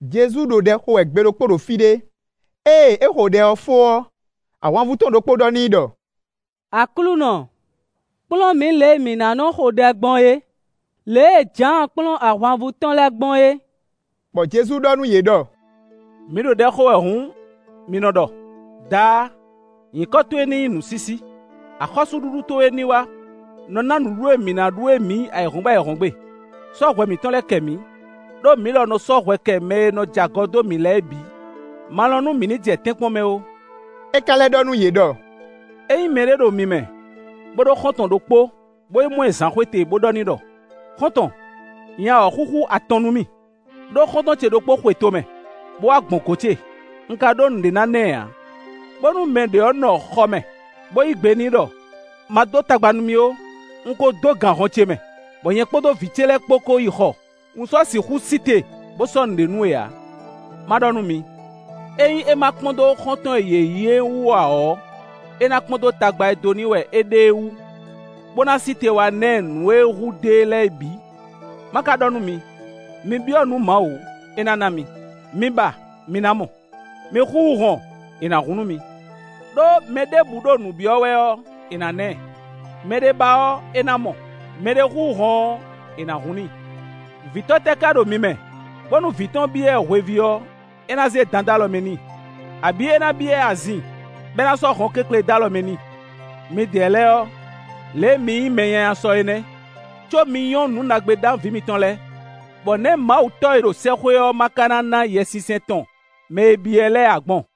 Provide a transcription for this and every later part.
Jezu ɖo ɖɛ xo wɛ gbe ɖokpó ɖo fí ɖé. Ée é xo ɖɛ ɔ́ fó ɔ́, ahwanvú tɔn ɖokpó ɖɔ n'i ɖɔ: “Aklúnɔ, kplɔ́n mǐ lě e mǐ ná nɔ́ xo ɖɛ gbɔn é, lě e Jǎan kplɔ́n ahwanvú tɔn lɛ́ɛ gbɔn é.” Bɔ Jezu ɖɔ nú yě ɖɔ: “Mi ɖo ɖɛ xo wɛ hǔn, mi nɔ ɖɔ: ‘Daá! Nyǐkɔ towe ní nyí nǔsísí; axɔ́súɖuɖu towe ní wá; nɔ ná nǔɖuɖu e mǐ ná ɖu é mǐ ayǐhɔ́ngbe ayǐhɔ́ngbe; sɔ́ hwɛ mǐtɔn lɛ́ɛ kɛ mǐ, ɖó mǐ lɔ nɔ sɔ́ hwɛ kɛ mɛ e nɔ jɛ agɔ dó mǐ lɛ́ɛ bǐ; ma lɔn nú mǐ ní jɛ tɛ́nkpɔ́n mɛ ó.’” É ka lɛ́ ɖɔ nú yě ɖɔ: “Ényí mɛɖé ɖo mi mɛ, bó ɖó xɔ́ntɔn ɖokpó, bó yi mɔ ɛ zǎnxwete, bó ɖɔ n'i ɖɔ: ‘Xɔ́ntɔn, nya wɔ̌xúxú atɔn nú mì, ɖó xɔ́ntɔn ce ɖokpó xwe tomɛ, bó wá gbɔn gɔ̌n ce; un ka ɖó nǔɖé ná ná ɛ ǎ,’ bónú mɛ ɖě ɔ́ nɔ xɔ mɛ, bó yí gbe n'i ɖɔ: ‘Ma dó tagba nú mì ó. Un ko dó gan hɔn ce mɛ, bɔ nyɛ kpódó vǐ ce lɛ́ɛ kpó kó yi xɔ; un sɔ́ sixú sí te bó sɔ́ nǔɖé nú we ǎ.’ Ma ɖɔ nú mi: ényí é má kpɔ́n dó xɔ́ntɔn e yě nyí ɔ́ wú ǎ ɔ́, é ná kpɔ́n dó tagba e dó n'i wɛ é ɖe é wú, bó ná sí te wá ná ɛ nǔ e hu dó e lɛ́ɛ é bǐ. Ma ka ɖɔ nú mi: mi byɔ́ nǔ Mawu, é ná ná mi; mi ba, mi ná mɔ; mi xúxú hɔn, è nǎ hun nú mi. Đó, mɛ ɖěbǔ ɖo nǔ byɔ́ wɛ ɔ́, è nǎ na ɛ; mɛɖé ba ɔ́, é ná mɔ; mɛɖé xúxú hɔn ɔ́, è nǎ hun n'i. Vǐtɔ́ tɛ́ ká ɖo mi mɛ, bónú vǐ tɔn byɔ́ ɛ hweví ɔ́, é ná zé dan dó alɔ mɛ n'i? Abǐ, é ná byɔ́ ɛ azin, bɔ é ná sɔ́ hɔnkéklě dó alɔ mɛ n'i? Midɛɛ lɛ́ɛ ɔ́, lě e mi nyí mɛ nyanya sɔ é nɛ́, có mi nyɔ́ nǔ ɖagbe ná vǐ mitɔn lɛ́ɛ. Bɔ nɛ̌ Mawu Tɔ́ e ɖo sɛ́xwé ɔ́ má ka ná ná Yɛsinsɛn tɔn mɛ e byɔ́ ɛ lɛ́ɛ ǎ gbɔn?”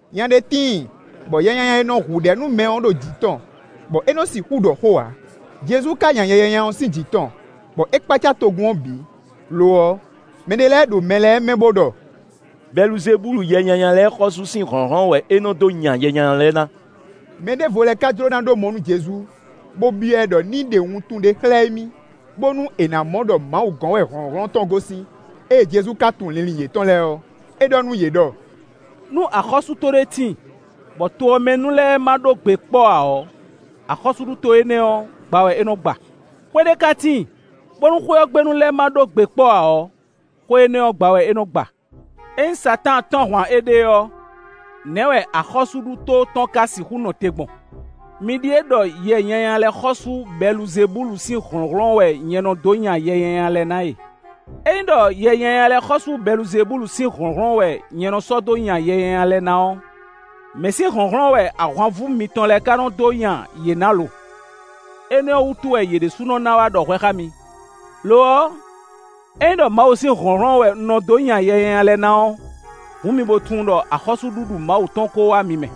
Nya ɖé tíin bɔ yɛ nyanya e nɔ hu ɖɛ̌ nú mɛ ɔ́ ɖo jǐ tɔn, bɔ é nɔ sixú ɖɔ xó ǎ; Jezu ka nya yɛ nyanya ɔ́ sín jǐ tɔn, bɔ é kpácá togun ɔ́ bǐ. Lo ɔ́, mɛ ɖé lɛ́ɛ ɖo mɛ lɛ́ɛ mɛ bó ɖɔ: “Bɛluzebúlu yɛ nyanya lɛ́ɛ xɔ́sú sín hlɔ̌nhlɔ́n wɛ é nɔ́ dó nya yɛ nyanya lɛ́ɛ ná.” Mɛ ɖěvo lɛ́ɛ ká jló ná ɖó mɔ nú Jezu, bó byɔ́ ɛ ɖɔ ní ɖe wuntun ɖé xlɛ́ émí, bónú è nǎ mɔ ɖɔ Mawu gɔ̌n wɛ hlɔ̌nhlɔ́n tɔn gosín. Ée Jezu ka tunwun linlin yětɔn lɛ́ɛ ɔ́, é ɖɔ nú yě ɖɔ: “Nú axɔ́súɖuto ɖé tíin, bɔ to ɔ́ mɛ nu lɛ́ɛ ma ɖó gbe kpɔ́ ǎ ɔ́, axɔ́súɖuto énɛ́ ɔ́, gba wɛ é nɔ gba; xwé ɖé ka tíin, bónú xwé ɔ́ gbe nu lɛ́ɛ ma ɖó gbe kpɔ́ ǎ ɔ́, xwé énɛ́ ɔ́ gba wɛ é nɔ gba. Ényí Satáan tɔ́n ahwan éɖée ɔ́, nɛ̌ wɛ axɔ́súɖuto tɔn ka sixú nɔ te gbɔn? Mi ɖíe ɖɔ yɛ nyanya lɛ́ɛ xɔ́sú Bɛluzebúlu sín hlɔ̌nhlɔ́n wɛ nyɛ nɔ dó nya yɛ nyanya lɛ́ɛ ná e. Ényí ɖɔ yɛ nyanya lɛ́ɛ xɔ́sú Bɛluzebúlu sín hlɔ̌nhlɔ́n wɛ nyɛ nɔ sɔ́ dó nya yɛ nyanya lɛ́ɛ ná ɔ́, mɛ̌ sín hlɔ̌nhlɔ́n wɛ ahwanvú mitɔn lɛ́ɛ ká nɔ dó nya yě ná lo? Énɛ́ ɔ́ wútu wɛ yě ɖésúnɔ ná wá ɖɔ hwɛ xá mi. Lo ɔ́, é nyí ɖɔ Mawu sín hlɔ̌nhlɔ́n wɛ un nɔ dó nya yɛ nyanya lɛ́ɛ ná ɔ́, hǔn mi bó tunwun ɖɔ axɔ́súɖuɖu Mawu tɔn kó wá mi mɛ.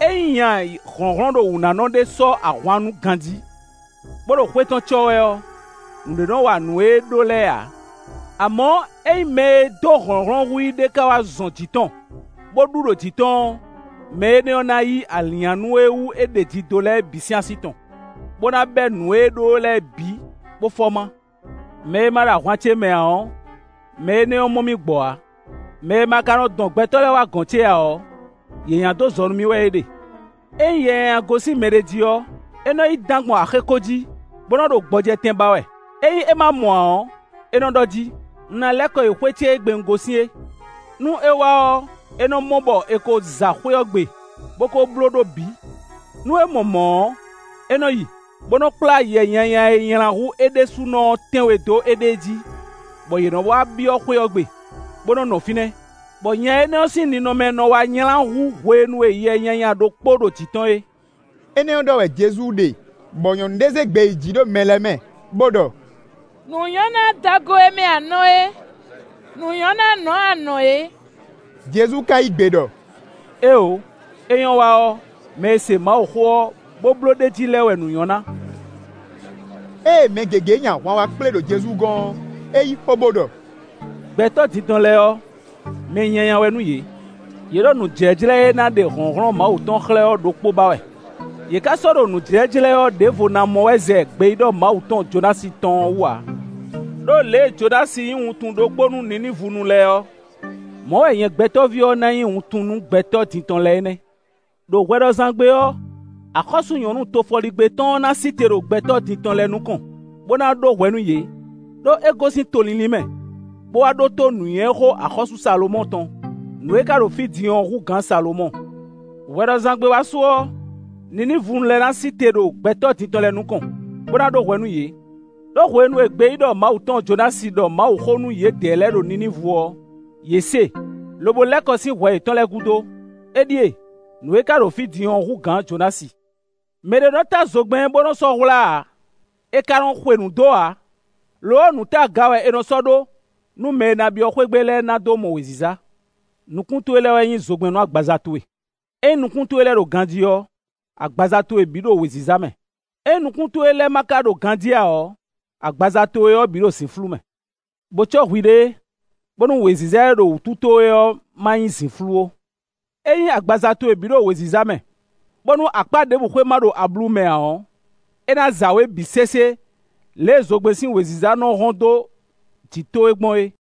“Ényí nya hlɔ̌nhlɔ́nɖowǔnánɔ ɖé sɔ́ ahwannú ganjí, bó ɖo xwé tɔn cɔ́ wɛ ɔ́, nǔɖé nɔ́ wa nǔ e é ɖó lɛ́ɛ ǎ. Amɔ̌, ényí mɛ e dó hlɔ̌nhlɔ́n hú i é ɖě ká wá zɔn jǐ tɔn, bó ɖu ɖo jǐ tɔn ɔ́, mɛ énɛ́ ɔ́ ná yí alǐnnyánú e wú é ɖeji dó lɛ́ɛ bǐ sín así tɔn, bó ná bɛ́ nǔ e é ɖó lɛ́ɛ bǐ, bó fɔ má. “Mɛ e ma ɖo ahwan ce mɛ ǎ ɔ́, mɛ énɛ́ mɔ mì gbɔ ǎ; mɛ e ma ka nɔ dɔn gbɛtɔ́ lɛ́ɛ wá gɔ̌n ce ǎ ɔ́, yě nya dó zɔ nú mì wɛ é ɖe.” “Ényí yɛ nyanya gosín mɛɖé jí ɔ́, é nɔ́ yi dán gbɔn axéko jí, bó nɔ́ ɖo gbɔjɛtɛn ba wɛ. Ényí é má mɔ ǎ ɔ́, é nɔ́ ɖɔ jí: ‘Un ná lɛ́ kɔ yi xwé ce e gbe un gosín é.’ Nú é wá ɔ́, é nɔ mɔ bɔ è ko za xwé ɔ́ gbe, bó ko blóɖó bǐ. Nú é mɔ mɔ̌ ɔ́, é nɔ yi, bó nɔ́ kplá yɛ nyanya e nylá hú é ɖésúnɔ ɔ́ tɛ́nwe dó éɖée jí, bɔ yě nɔ wá byɔ́ xwé ɔ́ gbe, bó nɔ́ nɔ fínɛ́, bɔ nya énɛ́ ɔ́ sín ninɔmɛ nɔ wá nylá hú hwenu e yɛ nyanya ɖokpó ɖo jǐ tɔn é.” Énɛ́ ɔ́ ɖɔ wɛ Jezu ɖe bɔ nyɔ̌nu ɖé zé gbe yi jǐ ɖo mɛ lɛ́ɛ mɛ, bó ɖɔ: “Nǔ nyɔ́ nú adɔgo e mɛ a nɔ é! Nǔ nyɔ́ nú anɔ̌ e a nɔ̌ é.” Jezu ka yí gbe ɖɔ: “Éeǒ! É nyɔ́ wa ɔ́, mɛ e se Mawuxó ɔ́, bó bló ɖ'é jí lɛ́ɛ wɛ nǔ nyɔ́ ná.” Ée mɛ gěgé nyi ahwan wá kplé ɖo Jezu gɔ́n ɔ́, é yí xó bó ɖɔ: “Gbɛtɔ́ din tɔn lɛ́ɛ ɔ́, mɛ nyanya wɛ nú yě; yě ɖo nǔjíjlɛ́ e ná ɖe hlɔ̌nhlɔ́n Mawu tɔn xlɛ́ ɔ́ ɖokpó ba wɛ; yě ká sɔ́ ɖo nǔjíjlɛ́ ɔ́ ɖěvo ná mɔ wɛ zɛ gbeyíɖɔ Mawu tɔn Jonási tɔn ɔ́ wú ǎ. Đó lě e Jonási nyí wuntun ɖokpó nú Ninívunu lɛ́ɛ ɔ́, mɔ̌ wɛ nyɛ Gbɛtɔ́ví ɔ́ ná nyí wuntun nú gbɛtɔ́ din tɔn lɛ́ɛ é nɛ́. Đo hwɛɖɔzán gbe ɔ́, axɔ́sú-nyɔ̌nu tofɔligbé tɔn ɔ́ ná sí te ɖo gbɛtɔ́ din tɔn lɛ́ɛ nukɔn, bó ná ɖó hwɛ nú yě; ɖó é gosín to línlín mɛ, bó wá ɖótó nǔnywɛ́xó axɔ́sú Salomɔ́ɔ tɔn. Nǔ e ka ɖo fí din ɔ́ hú gǎn Salomɔ́ɔ. Hwɛɖɔzán gbe wá su ɔ́, Ninívunu lɛ́ɛ ná sí te ɖo gbɛtɔ́ din tɔn lɛ́ɛ nukɔn, bó ná ɖó hwɛ nú yě; ɖó hwenu e gbeyíɖɔ Mawu tɔn Jonási ɖɔ Mawuxó nú yědɛɛ lɛ́ɛ ɖo Ninívu ɔ́, yě se, lobo lɛ́ kɔ sín hwɛ yětɔn lɛ́ɛ gúdo; éɖíe: nǔ e ka ɖo fí din ɔ́ hú gǎn Jonási.” “Mɛ ɖé nɔ́ tá zogbɛ́n bó nɔ́ sɔ́ hwlá ǎ; è ka nɔ xwe nǔ dó ǎ. Lo ɔ́, nǔ ta aga wɛ è nɔ sɔ́ ɖó, nú mɛ e ná byɔ́ xwé gbe lɛ́ɛ ná dó mɔ wěziza. Nukún towe lɛ́ɛ wɛ nyí zogbɛ́n nú agbaza towe; ényí nukún towe lɛ́ɛ ɖo ganjí ɔ́, agbaza towe bǐ ɖo wěziza mɛ. Ényí nukún towe lɛ́ɛ ma ka ɖo ganjí ǎ ɔ́, agbaza towe ɔ́ bǐ ɖo zǐnflú mɛ. Bo cɔ́ hwiɖée, bónú wěziza e ɖo wǔtu towe ɔ́ má nyí zǐnflú ó. Ényí agbaza towe bǐ ɖo wěziza mɛ, bónú akpá ɖěbǔ xwé ma ɖo ablu mɛ ǎ ɔ́, é ná za wě bǐ sésé lě e zogbɛ́n sín wěziza nɔ́ hɔ́n dó jǐ towe gbɔn é.”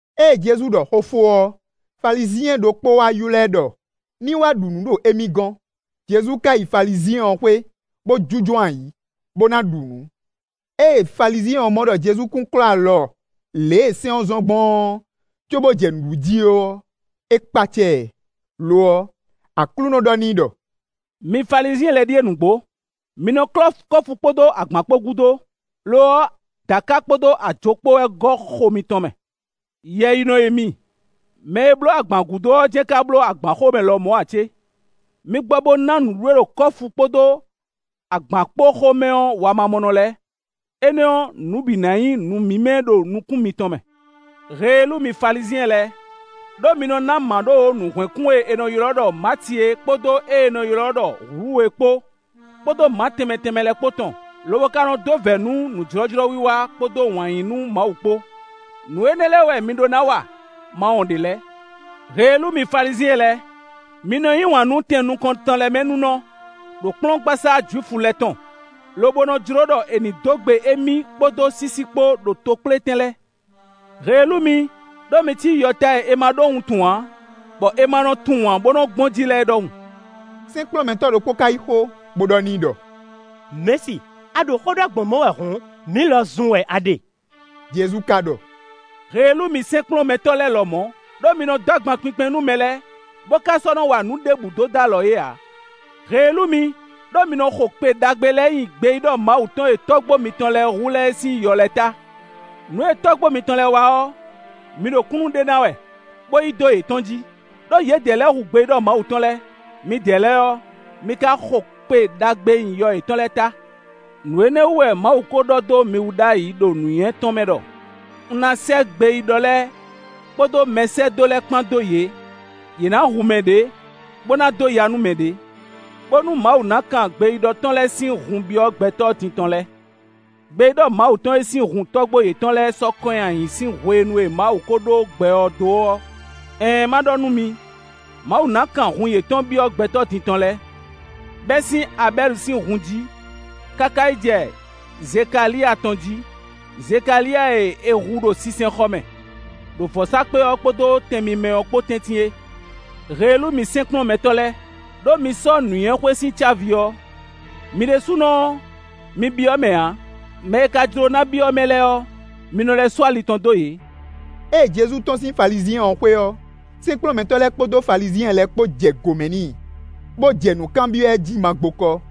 Ée Jezu ɖɔ xó fó ɔ́, Falizyɛn ɖokpó wá ylɔ́ ɛ ɖɔ ní wá ɖu nǔ ɖo émí gɔ́n. Jezu ka yi Falizyɛn ɔ́ xwé, bó jínjɔ́n ayǐ, bó ná ɖu nǔ. Ée Falizyɛn ɔ́ mɔ ɖɔ Jezu kún klɔ́ alɔ lě e sɛ́n ɔ́ zɔ́n gbɔn ɔ́ cóbó jɛ nǔ ɖu jí ó ɔ́, é kpácá ɛ. Lo ɔ́, Aklúnɔ ɔ́ ɖɔ n'i ɖɔ: “Mi Falizyɛn lɛ́ɛ ɖíe nǔgbó; mi nɔ klɔ́ kɔ́fu kpódó agbǎn kpó gúdo; lo ɔ́, dǎka kpódó ajo kpó wɛ gɔ́ xo mitɔn mɛ. Yɛyinɔ e mi! Mɛ e bló agbǎn gúdo ɔ́ jɛ́n ká bló agbǎn xomɛ lɔmɔ̌ ǎ cé? Mi gbɔ bó ná nǔɖuɖu e ɖo kɔ́fu kpódó agbǎn kpó xomɛ ɔ́ wamamɔnɔ lɛ́ɛ; énɛ́ ɔ́, nǔ bǐ ná nyí nǔ mímɛ́ ɖo nukún mitɔn mɛ. “Heelú mi Falizyɛn lɛ́ɛ! Đó mi nɔ ná mǎɖówǒ nǔhwɛ́nkún e è nɔ ylɔ́ ɖɔ mati é kpódó ée è nɔ ylɔ́ ɖɔ hlúu é kpó, kpódó mǎ tɛnmɛ tɛnmɛ lɛ́ɛ kpó tɔn lobo ka nɔ dó vɛ̌ nú nǔjlɔ́jlɔ́wiwa kpódó wǎn yí nú Mawu kpó. Nǔ énɛ́ lɛ́ɛ wɛ mi ɖó ná wa, ma wɔn ɖě lɛ́ɛ. “Heelú mi Falizyɛn lɛ́ɛ! Mi nɔ yí wǎn nú tɛn nukɔntɔn lɛ́ɛ mɛ ninɔ, ɖo kplɔ́ngbasá Jwifu lɛ́ɛ tɔn, lobo nɔ jló ɖɔ è nǐ dó gbe émí kpódó sísí kpó ɖo tokplétɛn lɛ́ɛ. Heelú mi, ɖó mi cí yɔta e è ma ɖó wuntun ǎ, bɔ è ma nɔ tunwun ǎ bó nɔ́ gbɔn jí lɛ́ɛ é ɖɔhun.” Sɛ́nkplɔ́nmɛtɔ́ ɖokpó ka yí xó, bó ɖɔ n'i ɖɔ: “Mɛ̌si, a ɖo xó ɖɔ gbɔn mɔ̌ wɛ hǔn, mǐ lɔ zun wɛ a ɖe.” Jezu ka ɖɔ: “Heelú mi sɛ́nkplɔ́nmɛtɔ́ lɛ́ɛ lɔmɔ̌, ɖó mi nɔ dó agban kpinkpɛn nú mɛ lɛ́ɛ, bó ka sɔ́ nɔ wa nǔ ɖěbǔ dó dó alɔ yě ǎ! Heelú mi, ɖó mi nɔ xo kpe ɖagbe lɛ́ɛ nyi gbeyíɖɔ Mawu tɔn e tɔ́gbó mitɔn lɛ́ɛ hu lɛ́ɛ é sín yɔ lɛ́ɛ ta! Nǔ e tɔ́gbó mitɔn lɛ́ɛ wa ɔ́, mi ɖo kúnnu ɖe ná wɛ, bó yí dó yětɔn jí; ɖó yědɛɛ lɛ́ɛ hu gbeyíɖɔ Mawu tɔn lɛ́ɛ; midɛɛ lɛ́ɛ ɔ́, mi ka xo kpe ɖagbe nyi yɔ yětɔn lɛ́ɛ ta! Nǔ énɛ́ wú wɛ Mawu ko ɖɔ dó mi wú ɖ'ayǐ ɖo nǔnywɛ́ tɔn mɛ ɖɔ: ‘Un ná sɛ́ gbeyíɖɔ lɛ́ɛ kpódó mɛsɛ́dó lɛ́ɛ kpán dó yě; yě ná hu mɛ ɖě, bó ná dó ya nú mɛ ɖě,’ bónú Mawu ná kan gbeyíɖɔ tɔn lɛ́ɛ sín hun byɔ́ gbɛtɔ́ din tɔn lɛ́ɛ; gbeyíɖɔ Mawu tɔn e sín hun tɔ́gbó yětɔn lɛ́ɛ sɔ́ kɔn nyi ayǐ sín hwenu e Mawu ko ɖó gbɛ ɔ́ dó é; ɛɛn, má ɖɔ nú mi; Mawu ná kan hun yětɔn byɔ́ gbɛtɔ́ din tɔn lɛ́ɛ, bɛ́ sín Abɛ́li sín hun jí, káká yi jɛ Zekaliya tɔn jí; Zekaliya e è hu ɖo sinsɛnxɔ mɛ, ɖo vɔ̌sákpe ɔ́ kpódó tɛn mímɛ́ ɔ́ kpó tɛ́ntin é. “Heelú mi sɛ́nkplɔ́nmɛtɔ́ lɛ́ɛ, ɖó mi sɔ́ nǔnywɛ́xwé sín cávi ɔ́; mi ɖésúnɔ ɔ́, mi byɔ́ mɛ ǎ; mɛ e ka jló ná byɔ́ mɛ lɛ́ɛ ɔ́, mi nɔ lɛ́ sú ali tɔn dó yě!” Ée Jezu tɔ́n sín Falizyɛn ɔ́ xwé ɔ́, sɛ́nkplɔ́nmɛtɔ́ lɛ́ɛ kpódó Falizyɛn lɛ́ɛ kpó jɛ gǒmɛ n'i, bó jɛ nǔ kanbyɔ́ ɛ jí magbokɔ,